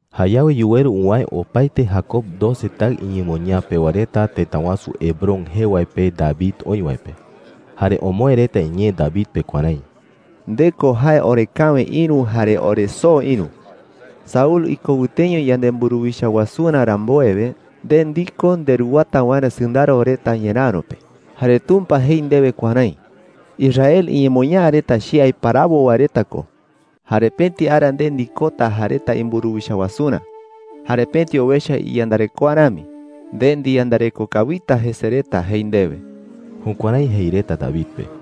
Jayawe yuweru uwäe opaete Jacob doce taɨ iñemoñaa pewa reta tëta wasu Hebrón jee wae pe David oï wae pe. Jare omoë reta iñee David pe kuärái: “Nde ko jae orekäwe ïru jare oresoo ïru,” jei reta. “Saúl iko wɨteño yanemburuwicha wasurä rambuewe, nde ndiko nderuwata waerä sɨndaro reta ñeräro pe. Jare Tumpa jei ndewe kuärái: ‘Israel iñemoñaa reta che aiparawo wae reta ko. Jare pëti ara nde ndikota jae reta imburuwicha wasurä. Jare pëti owecha iyandarekoa rami, nde ndiyandareko kawita jese reta,’ jei ndewe.” Jukuärái jei reta David pe.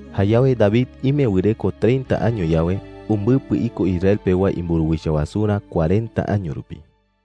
Jayawe David ime wɨreko treinta año yawe, umbɨpɨ iko Israel pewa reta imburuwicha wasurä cuarenta año rupi.